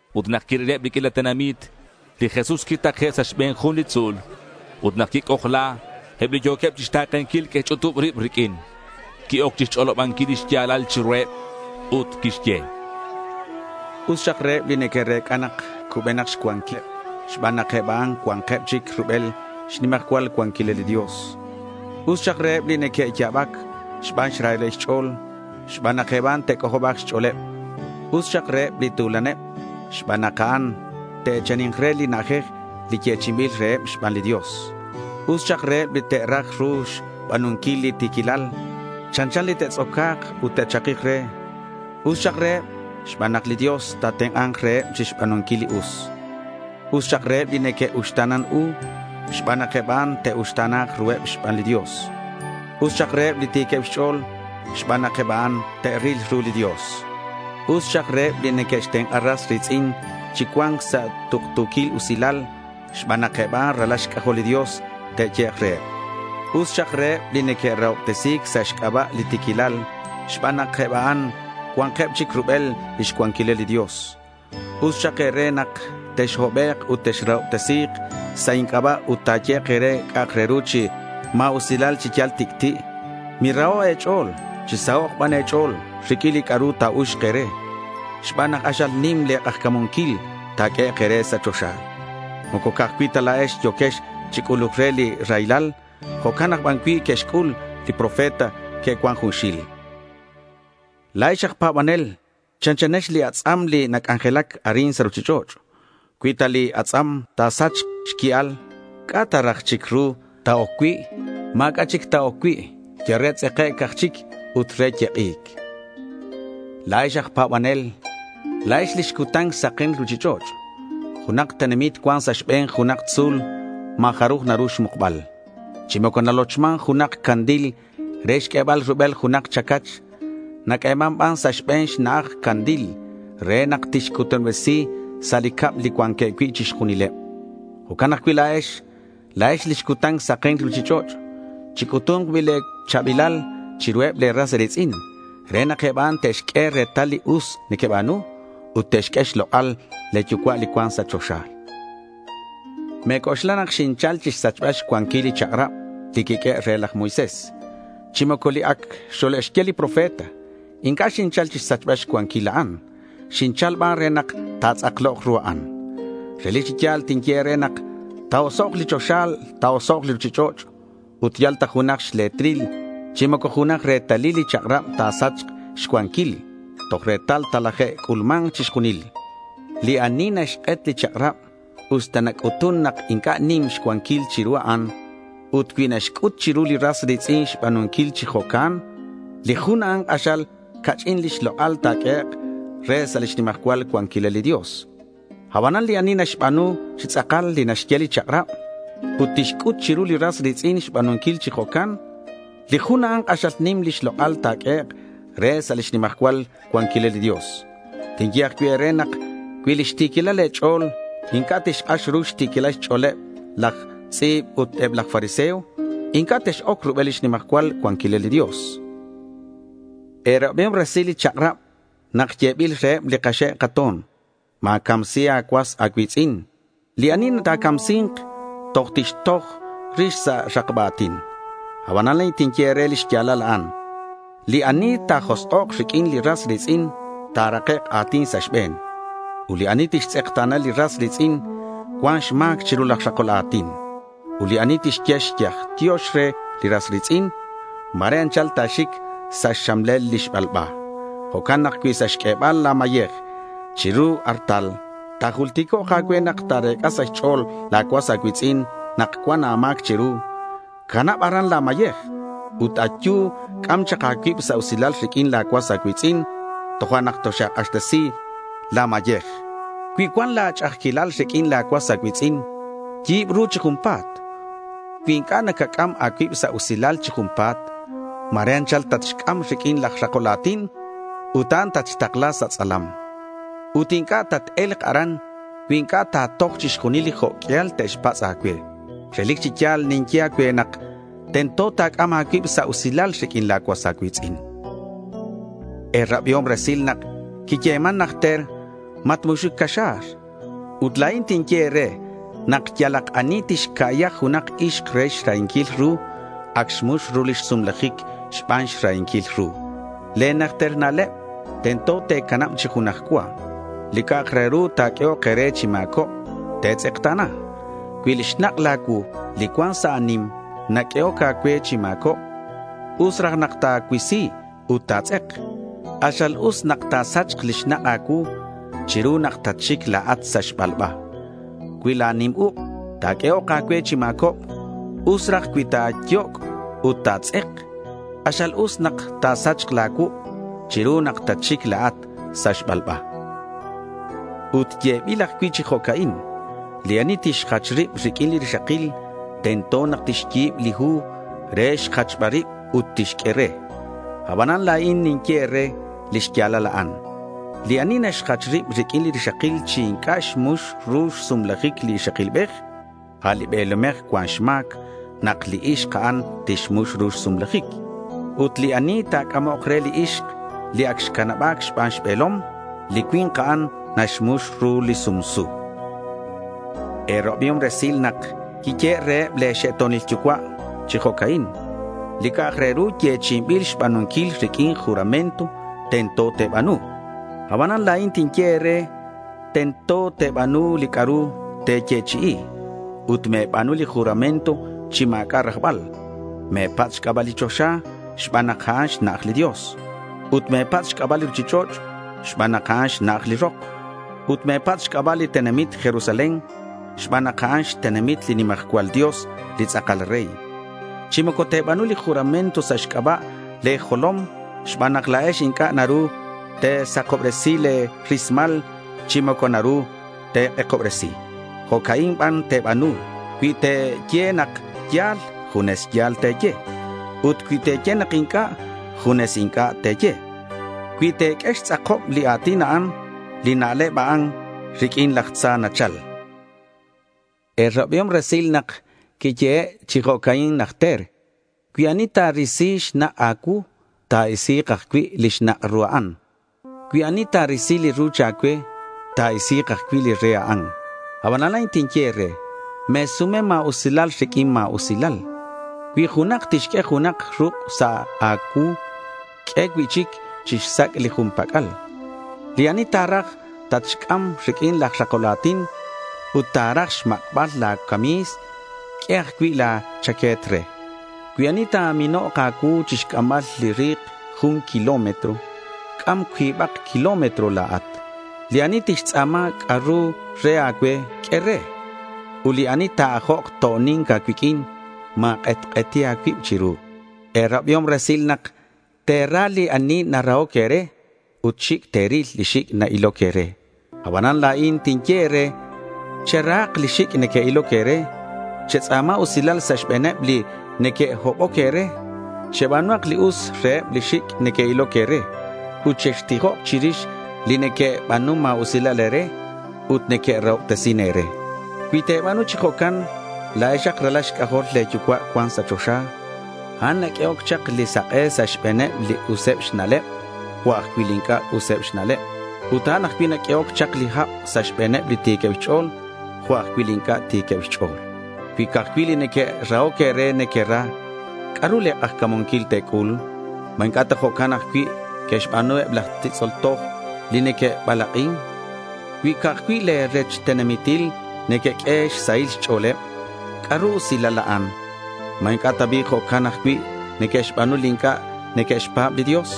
Ut nak quirileb li q'uila tenamit, li Jesús quitake' sa' xbe̱n jun li tzu̱l. Ut nak quic'ojla, eb li yo̱queb chixta̱kenquil que'xch'utub rib riq'uin. Qui-oc chixch'olobanquil li xya̱lal chiruheb ut quixye: —Us xak reheb li neque'rec'a nak cubenak xcuanquileb xban nak eb a'an cua̱nkeb chic rubel lix nimajcual cuanquilal li Dios. Us xak reheb li neque'ya̱bac xban xrahileb xch'o̱l xban nak eb a'an ta̱c'ojoba̱k xch'o̱leb. Us xak reheb li tu̱laneb xban nak eb a'an te'e̱chani̱nk re li na'ajej li yechi'inbil reheb xban li Dios. Us xak reheb li te'raj ru xba̱nunquil li ti̱quilal. Chanchan li te'tz'oca̱k ut te'chakik re. Us xak reheb xban nak li Dios ta̱tenk'a̱nk reheb chixba̱nunquil li us. Us xak reheb li neque'uxta̱nan u xban nak eb a'an te'uxta̱na̱k ruheb xban li Dios. Us xak reheb li ti̱queb xch'o̱l xban nak eb a'an te'ril ru li Dios. Us xak reheb li neque'xtenk'a ras ri̱tz'in chi cua̱nc sa' tuktu̱quil usilal xban nak eb a'an ralal xc'ajol li Dios te'yehek' reheb. Us xak reheb li neque'rahobtesi̱c sa' xc'aba' li ti̱quilal, xban nak eb a'an cua̱nkeb chic rubel lix cuanquilal li Dios. Us xak e̱re nak texhobek' ut texrahobtesi̱k sa' inc'aba' ut ta̱yehek' e̱re c'a'ak re ru chi ma̱usilal chi yal tic'ti'. Miraho' e̱ch'o̱l. Chisahok' ban e̱ch'o̱l riq'uin li c'a'ru ta̱uxk e̱re xban nak k'axal nim le̱ k'ajca̱munquil ta̱q'uehek' e̱re sa' choxa. Moco ca'aj cui' ta la̱ex yo̱quex chi c'uluc re li raylal. Jo'can aj ban cui' que'xc'ul li profeta li que'cuan junxil. La̱ex aj pa̱banel chanchanex li atz'am li nac'anjelac arin sa' ruchich'och'. Cui ta li atz'am ta̱sachk xqui'al, ¿c'a' ta raj chic ru ta̱oc cui'? Ma̱c'a' chic ta̱oc cui'. Yal re tz'ekec' aj chic ut re yek'i̱c. La̱ex aj pa̱banel, la̱ex lix cutan saken li ruchich'och'. Junak tenamit cuan sa' xbe̱n junak tzu̱l ma̱ jaruj naru xmukbal. Chi moco nalochman junak candil re xq'uebal rubel junak chacach. Naq'ueman ban sa' xbe̱n xna'aj candil re nak tixcutanobresi sa' li cab li cuanqueb cui' chixjunileb. Jo'can ajcui' la̱ex. La̱ex lix cutan saken li ruchich'och'. Chic'utu̱nk bi' le̱ cha̱bilal chiruheb le̱ ras e̱ri̱tz'in re nak eb a'an te'xq'ue retal li us nequeba̱nu ut te'xq'ue xlok'al le̱ Yucua' li cuan sa' choxa. Me̱c'oxla nak xinchal chixsachbal xcuanquil li chak'rab li quiq'uehe' re laj Moisés chi moco li ac xole'xye li profeta. Inc'a' xinchal chixsachbal xcuanquil a'an. Xinchal ban re nak ta̱tz'aklok ru a'an. Relic chi ya̱l tinye e̱re nak ta̱osok' li choxa, ta̱osok' li ruchich'och', ut yal ta jun xle̱tril chi moco junak retalil li chak'rab ta̱sachk xcuanquil. Toj retal talaje'c'ulma̱nk chixjunil. Li ani naxk'et li chak'rab, usta nac'utun nak inc'a' nim xcuanquil chiru a'an, ut cui naxc'ut chiru li ras ri̱tz'in xba̱nunquil chi jo'can, li jun a'an k'axal ca'ch'in lix lok'al ta̱q'uehek' re sa' lix nimajcual cuanquilal li Dios. Abanan li ani naxba̱nu chi tz'akal li naxye li chak'rab, ut tixc'ut chiru li ras ri̱tz'in xba̱nunquil chi jo'can, li jun a'an k'axal nim lix lok'al ta̱q'uehek' re sa' lix nimajcual cuanquilal li Dios. Tinye ajcui' e̱re nak cui lix ti̱quilal le̱ ch'o̱l inc'a' tixk'ax ru xti̱quilal xch'o̱leb laj tz'i̱b ut eb laj fariseo, inc'a' tex-oc rubel lix nimajcual cuanquilal li Dios. E̱rabiom resil li chak'rab nak yebil reheb li kaxe' kato̱n: Ma̱camsi a̱cuas a̱cui̱tz'in. Li ani ta̱camsi̱nk, toj tixtoj rix sa' rakba a̱tin. Aban la̱in tinye e̱re lix ya̱lal a'an. Li ani ta̱josk'ok riq'uin li ras ri̱tz'in ta̱rakek' a̱tin sa' xbe̱n. Ut li ani tixtz'ekta̱na li ras ri̱tz'in cuan xma̱c chiru laj rakol a̱tin. Ut li ani tixye xyaj tiox re li ras ri̱tz'in, ma̱re anchal ta̱xic sa' xxamlel li xbalba. Jo'can nak cui sa' xq'uebal la̱ mayej chiru li artal ta̱julticok' a̱cue nak ta̱rec'a sa' xch'o̱l la̱ cuas a̱cui̱tz'in nak cuan a̱ma̱c chiru, canab aran la̱ mayej, ut ayu, c'am chak a̱cuib sa' usilal riq'uin la̱ cuas a̱cui̱tz'in, tojo'nak toxa̱k'axtesi la̱ mayej. Cui cuan la̱ ch'a'ajquilal riq'uin la̱ cuas a̱cui̱tz'in, yi̱b ru chi junpa̱t. Cui inc'a' nacac'am a̱cuib sa' usilal chi junpa̱t, ma̱re anchal tatxc'am riq'uin laj rakol a̱tin ut a'an tatxtakla sa' tz'alam. Ut inc'a' tat-e̱lk aran cui inc'a' ta̱toj chixjunil li jo' q'uial te'xpatz' a̱cue. Relic chi ya̱l ninye a̱cue nak tento ta̱c'am a̱cuib sa' usilal riq'uin la̱ cuas a̱cui̱tz'in. E̱rabiom resil nak quiyeman najter: Matmuxuc caxa̱r. Ut la̱in tinye e̱re nak yalak ani tixca'ya junak ixk re xrahinquil ru, ac xmux ru lix sumlajic xban xrahinquil ru. Le̱ najter na'leb tento te̱canab chi junaj cua. Li c'a'ak re ru ta̱q'uehok e̱re chi ma̱cobc, te̱tz'ekta̱na. Cui li xnak' la̱ cuu li cuan sa' a̱nim naq'uehoc a̱cue chi ma̱cobc, us raj nak ta̱cuisi ut ta̱tz'ek. K'axal us nak ta̱sachk li xnak' a̱cuu chiru nak tatxic la̱at sa' xbalba. Cui la̱ nim uk' naq'uehoc a̱cue chi ma̱cobc, us raj cui ta̱yoc' ut ta̱tz'ek. K'axal us nak ta̱sachk la̱ cuuk' chiru nak tatxic la̱at sa' xbalba. Ut yebil ajcui' chi jo'ca'in: Li ani tixjach rib riq'uin li rixakil, tento nak tixyi̱b li hu re xjachbal rib ut tixq'ue re. Abanan la̱in ninye e̱re li xya̱lal a'an. Li ani naxjach rib riq'uin li rixakil chi inc'a' xmux ru xsumlajic li ixakilbej, a' li be̱lomej cuan xma̱c nak li ixk a'an tixmux ru xsumlajic. Ut li ani ta̱c'amok re li ixk, li ac xcanaba̱c xban xbe̱lom, li cui̱nk a'an naxmux ru li sumsu. E̱rabiom resil nak quiyehe' reheb le̱ xe'to̱nil yucua' chi jo'ca'in: Li c'a'ak re ru te̱yechi'i xba̱nunquil riq'uin juramento, tento te̱ba̱nu. Abanan la̱in tinye e̱re tento te̱ba̱nu li c'a'ru te̱yechi'i ut me̱ba̱nu li juramento chi ma̱c'a' rajbal. Me̱patz' xc'aba' li choxa xban nak a'an xna'aj li Dios. Ut me̱patz' xc'aba' li ruchich'och' xban nak a'an xna'aj li rok. Ut me̱patz' xc'aba' li tenamit Jerusalén xban nak a'an xtenamit li nimajcual Dios, li tz'akal Rey. Chi moco te̱ba̱nu li juramento sa' xc'aba' le̱ jolom xban nak la̱ex inc'a' naru te̱sakobresi le̱ rismal chi moco naru te̱k'ekobresi. Jo'ca'in ban te̱ba̱nu. Cui te̱ye nak ya̱l, junes ya̱l te̱ye. Ut cui te̱ye nak inc'a', junes inc'a' te̱ye. Cui te̱q'ue xtz'akob li a̱tin a'an, li na'leb a'an riq'uin laj tza nachal. E̱rabiom resil nak quiyehe' chi jo'ca'in najter: Cui ani ta̱risi xnak' a̱cuu, ta̱isi̱k ajcui' li xnak' ru a'an. Cui ani ta̱risi li ruch a̱cue, ta̱isi̱k ajcui' li re a'an. Abanan la̱in tinye e̱re: Me̱sume ma̱usilal riq'uin ma̱usilal. Cui junak tixq'ue junak ruk' sa' a̱cuu, q'ue cui'chic chixsac' li jun pac'al. Li ani ta̱raj tatxc'am riq'uin laj rakol a̱tin ut ta̱raj xmak'bal la̱ cami̱s, q'ue ajcui' la̱ chaque̱t re. Cui ani ta̱minok a̱cuu chixc'ambal li ri̱k jun kilómetro, c'am cuibak kilómetro la̱at. Li ani tixtz'a̱ma c'a'ru re a̱cue, q'ue re. Ut li ani ta̱ajok to'oni̱nc a̱cuiq'uin, ma̱k'etk'eti a̱cuib chiru. E̱rabiom resil nak te̱ra li ani narahoc e̱re ut xic' te̱ril li xic' na-iloc e̱re. Abanan la̱in tinye e̱re, cherahak li xic' na-iloc e̱re. Chetz'a̱ma usilal sa' xbe̱neb li neque'hoboc e̱re. Cheba̱nuhak li us reheb li xic' neque'iloc e̱re ut chextijok chirix li neque'ba̱nun ma̱usilal e̱re ut neque'rahobtesin e̱re. Cui te̱ba̱nu chi jo'can, la̱exak ralal xc'ajol le̱ Yucua' cuan sa' choxa. A'an naq'uehoc chak li sak'e sa' xbe̱neb li useb xna'leb jo' ajcui' li inc'a' useb xna'leb. Ut a'an ajcui' naq'uehoc chak li hab sa' xbe̱neb li ti̱queb xch'o̱l jo' ajcui' li inc'a' ti̱queb xch'o̱l. Cui ca'aj cui' li neque'rahoc e̱re nequera, ¿c'a'ru le̱ k'ajca̱munquil te̱c'ul? ¿Ma inc'a' ta bi' jo'can ajcui' neque'xba̱nu eb laj titz'ol toj, li neque'balak'in? Ut cui ca'aj cui' le̱ rech tenamitil nequeq'ue xsahil xch'o̱leb, ¿c'a'ru rusil a'an? ¿Ma inc'a' ta bi' jo'can ajcui' neque'xba̱nu li inc'a' neque'xpa̱b li Dios?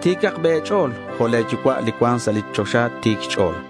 Ti̱cak bi' e̱ch'o̱l jo' le̱ Yucua' li cuan sa' li choxa ti̱c xch'o̱l.